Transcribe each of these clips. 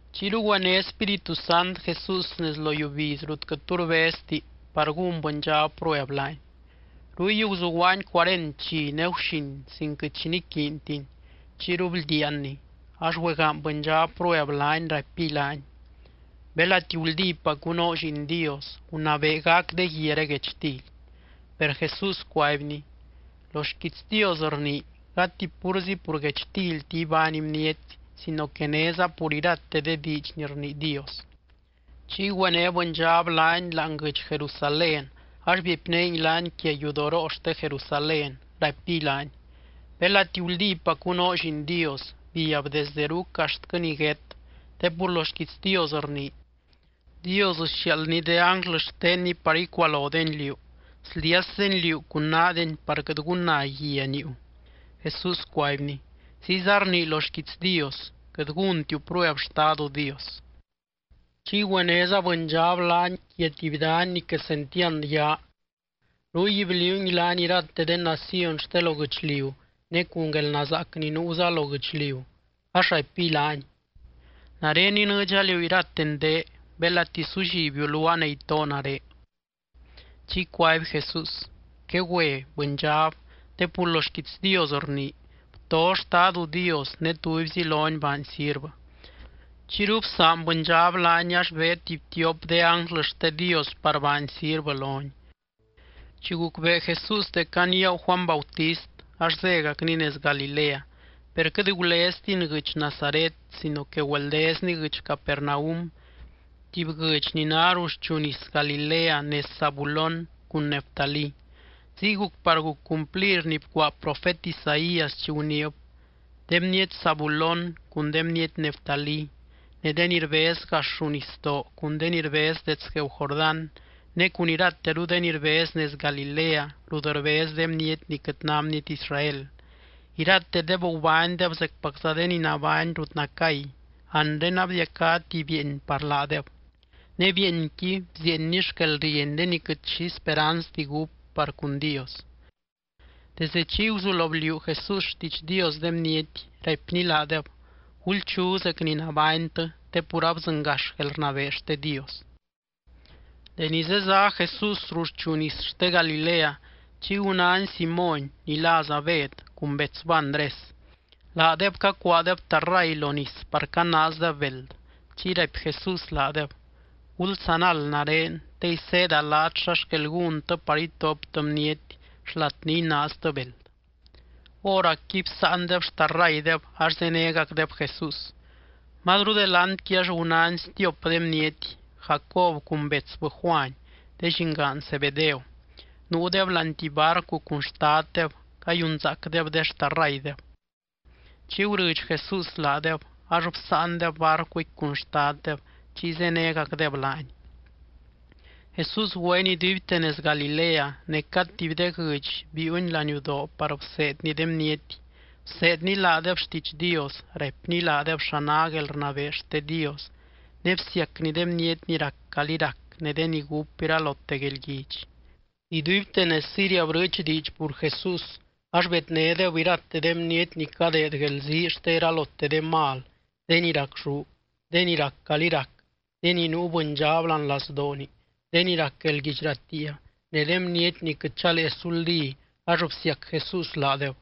Chiyru güené Spíritu Sant Jesús nez lo yiubiz rut quɨt tu rbezti par gún bɨndxab prueb laany. Ruy guzuguaany cuarent dxi ne guxin sin quɨt xi niquiintiny, chiyru bldiaanny. Ax güegaany bɨndxab prueb laany, raipiy laany: —Belati guldípacu noo Lliin Dios, gunabee gac de guiaré guechtily. Per Jesús cuaibny: —Lo xquiits Dios rnii: “Gati púrzi pur guechtilti ibány bniety sino que néza pur irate de diidx ni rnii Dios.” Chiy güené bɨndxab laany láani guɨdx Jerusalén ax biepinéngui laany quia yudoroo xte Jerusalén, raipiy laany: —Belati guldípacu noo Lliin Dios, biab desde ruc axtquɨ niguét, te pur lo xquiits Dios rnii: Dios sxiaaldny de ánglɨ xtenny par icualodeny liú. Sldiasdeny liú cun naadeny par quɨt gunna guia niiu. Jesús cuaibny: —Ziyza rnii lo xquiits Dios: “Quɨt gúntiu prueb Xtadu Dios.” Chiy güenéza bɨndxab laany quia tuby dany ni quesentiand yaa. Ruy bliuungui laany irate de naciony xte lo guɨchliu ne cun guelnazaac ni nuuza lo guɨchliu, ax raipiy laany: —Nare inɨɨdxa liú irate ndé, belati sullibiu luaa ne itoo nare. Chiy cuaby Jesús: —Quegüe, bɨndxab, te pur lo xquiits Dios rnii: “Bto Xtadu Dios ne tubyzi lony baany sirvɨ.” Chiyru bsaan bɨndxab laany, ax beed tuby tiop de ánglɨ xte Dios par baany sirvɨ lony. Chi gucbee Jesús dec aniagu Juany Bautist, ax zégacny nez Galilea. Per quɨt guleztiny guɨdx Nazaret, sino que güeldezny guɨdx Capernaum, tuby guɨdx ni ná ruxchu nis Galilea nez Zabulón cun Neftalí. Ziy guc par guc cumplir ni bcuaa profet Isaías chi guniib: De bniety Zabulón cun de bniety Neftalí, ne de ni rbez gax ruu nisdoo cun de ni rbez dets gueeu Jordán ne cun irateru de ni rbez nez Galilea rut rbez de bniety ni quɨt ná bniety Israel, iratedeb gubánydeb zecpacza de ni nabány rut nacay. Anre abdiacá tuby bieeny par laadeb ne bieenqui bzieeny xquelrieny de ni quɨt xi speranzti gúp par cun Dios. Desde chiy guzulo bliuu Jesús xtiidx Dios de bniety, raipny laadeb: —Gulchu zec ni nabánytɨ te pur abdzɨngax guelrnabee xte Dios. Deni zezá Jesús ruxchu nis xte Galilea, chiy gunány Simóny ni láza Bed cun betsbɨ Andrés. Laadeb cacuaadeb tarray lo nis par canaazdeb beld. Chiy raipy Jesús laadeb: —Gulsanald nare, te iseeda laat xa xquel gúntɨ par itoptɨ bniety xlat ni inaaztɨ beld. Hóracqui bsáandeb xtarraydeb ax zénegacdeb Jesús. Mazru delantqui ax gunány stiop de bniety, Jacob cun betsbɨ Juany, de llingaan Zebedeo. Nuudeb láani tuby barcu cun xtaddeb cayunzaacdeb de xtarraydeb. Chiy gurɨdx Jesús laadeb, ax bsáandeb barcuqui cun xtaddeb, chiy zénegacdeb laany. Jesús güeny iduibte nez Galilea, ne cad tuby de guɨdx biiuny laniudoo par bseedny de bniety. Bseedny laadeb xtiidx Dios, raipny laadeb xa ná guelrnabee xte Dios ne bsiacny de bniety ni rac calí rac ne de ni gúp iralote guelguidx. Iduibte nez Siria brɨɨch diidx pur Jesús, ax bednédeb irate de bniety ni cadeed guelzii xte iralote de mal, de ni racxú, de ni rac calí rac, de ni nuu bɨndxab láani lazdooni, de ni rac guelguidx ratiia ne de bniety ni quɨt chalee suldí ax bsiac Jesús laadeb.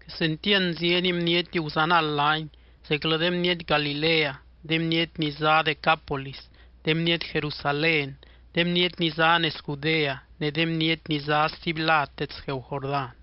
Quesentiand zieny bniety guzanald laany, zeclɨ de bniety Galilea, de bniety ni zá Decápolis, de bniety Jerusalén, de bniety ni zá nez Judea ne de bniety ni zá stuby lad dets gueeu Jordán.